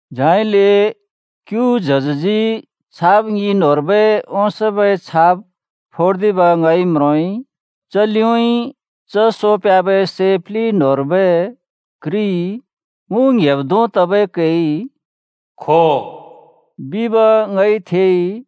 झाइले क्‍यु च्हजजी छाप ङि न्‍होंर्बै ओंसोंबै छाप फोर्दिब ङइ म्रोंइ। च लिउँइँ च सो प्ह्‍याबै सै प्लि न्‍होंर्बै घ्रिइ मु ङ्‌हेब् धों तबै कैइ “खो” बिब ङइ थेइ।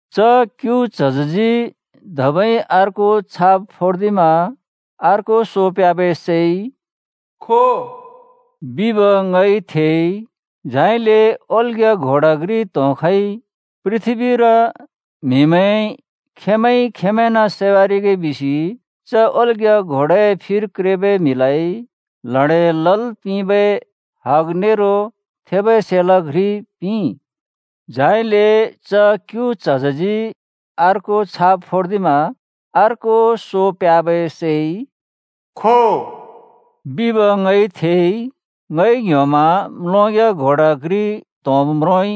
च क्‍यु च्हजजी धबै अर्को छाप फोर्दिमा अर्को सो प्ह्‍याबै सैइ “खो” बिब ङइ थेइ। झाइले ओल्‍ग्‍या घोडा घ्रि त्‍होंखइ। पृथ्‍बीर म्हिमैंइ खेंमैंइ-खेंमैंन् सैवारिगे बिसि च ओल्‍ग्‍या घोडाए फिर क्रेबै म्हिलाइ ल्हडें लल् पिंबै हग नेरो थेबै सेलाँ घ्रि पिंइ। झाइले च क्‍यु च्हजजी अर्को छाप फोर्दिमा अर्को सो प्ह्‍याबै सैइ “खो” बिब ङइ थेइ। ङइ ङ्ह्‍योमा म्‍लोंग्‍या घोडा घ्रि त्‍होंब् म्रोंइ।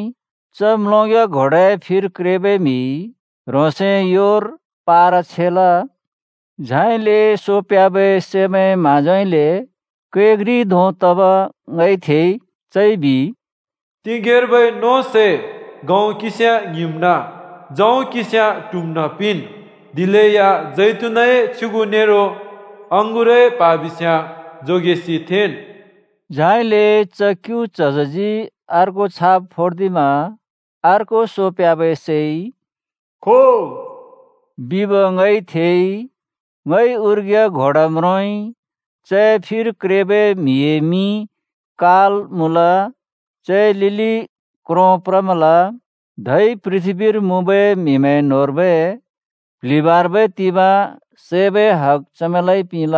च म्‍लोंग्‍या घोडाए फिर क्रेबै म्हिइ ह्रोंसए योर पार छेल। झाइले सो प्ह्‍याबै सैमैंए म्‍हाँजोउँइँले कै घ्रि धों तब ङइ थेइ। चइ बिइ, “तिगेंर्बै नों सै गहुँ किंस्याँ ङ्हिंम्‍ना, जौ किंस्याँ ट्हुम्‍ना पिंन्, दिलेया जैतुनए छ्युगु नेरो अँगुरए प्हा बिस्याँ जोगेसि थेंन्।” झाइले च क्‍यु च्हजजी अर्को छाप फोर्दिमा अर्को सो प्ह्‍याबै सैइ “खो” बिब ङइ थेइ। ङइ उर्ग्या घोडा म्रोंइ। चए फिर क्रेबै म्‍हिए मिं “काल” मुँल, चए लिलि क्रों प्रमल। धै पृथ्‍बीर मुँबै म्हिमैं न्होंर्बै प्ल्हिबाँर्बै तिंबाँ सैबै हग चमैंलाइ पिंल।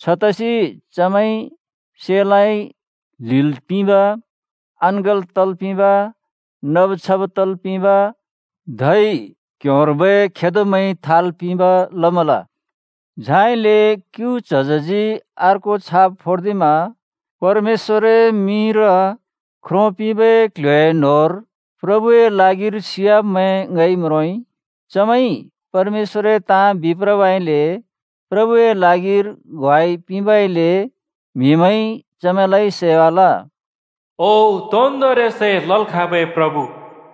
छतसि चमैंइ सेलाँइ ल्हिल् पिंब, अँङ्गल् तल् पिंब, नब छब तल् पिंब, धै क्ह्‍योंर्बै खेदोमैंइ थाल् पिंब लमल। झाइले क्‍यु च्हजजी अर्को छाप फोर्दिमा परमेश्‍वरए मिंर ख्रो पिंबै क्ल्ह्‍योए न्‍होंर प्रभुए ल्हागिर सियाब्‍मैं ङइ म्रोंइ। चमैंइ परमेश्‍वरए ताँ बिप्रबइले, प्रभुए ल्हागिर ग्वाइ पिंबइले, म्‍हिमैंइ चमैंलाइ सैवाल। “ओ, तोन्दोंरि सै लल् खाँबै प्रभु,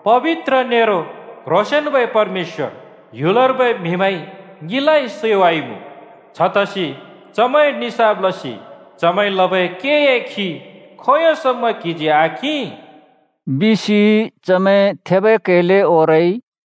पबित्र नेरो क्ह्रोंसेंन्‍बै परमेश्‍वर, ह्‍युलर्बै म्हिमैंइ ङिलाइ सैवाइमुँ। छतसि चमैंए निसाफ लसि चमैंइ लबै केए खि खोंयों समा क्हिजी आकिं?” बिसि चमैं थेबै कैले ओरइ।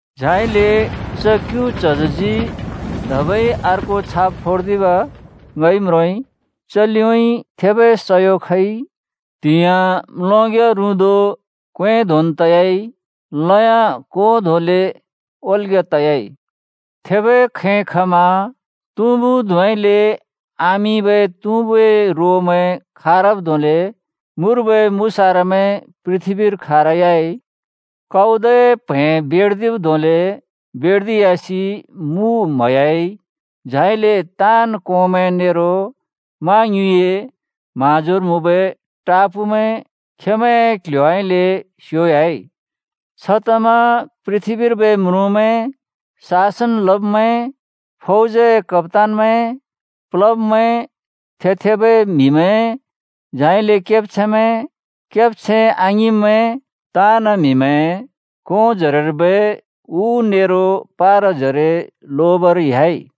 झाइले च क्‍यु च्हजजी धबै अर्को छाप फोर्दिब् ङइ म्रोंइ। च लिउँइँ थेबै सयो खइ। त्‍हिंयाँ म्‍लोंग्‍या रुँदो क्‍वें धोंन् तयाइ। लयाँ को धोंले ओल्‍ग्‍या तयाइ। थेबै खैं खमा तुँबु धुँउँइँले आमिंबै तुँबुए रोमैं खारब् धोंले मुर्बै मुसारामैं पृथ्‍बीर खारयाइ। काउदए प्हैं बेर्दिब् धोंले बेर्दियासि मु म्हयाइ। झाइले ताँन् कोंमैं नेरो मा ङ्युँइए म्हाँजोर मुँबै टापूमैं खेंमैंए क्‍ल्‍ह्‍योउँइँले स्‍योह्‍याइ। छतमा पृथ्‍बीर्बै म्रुँमैं, शासन लब्मैं, फौजए कप्‍तानमैं, प्लब्‍मैं, थे-थेबै म्‍हिमैं, झाइले केब्छैंमैं, केब्छैं आङिंब्मैं, ताँन् म्‍हिमैं कों जरेर्बै उ नेरो पाराजरे लोबर ह्‍याइ।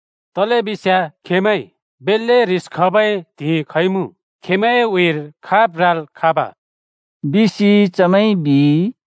तलेबिस्याँ खेंमैं बेल्‍ले ह्रिस खबै त्हिंइ खइमुँ। खेंमैंए उँइँर खाब् राल् खाँब?” बिसि चमैंइ बिइ।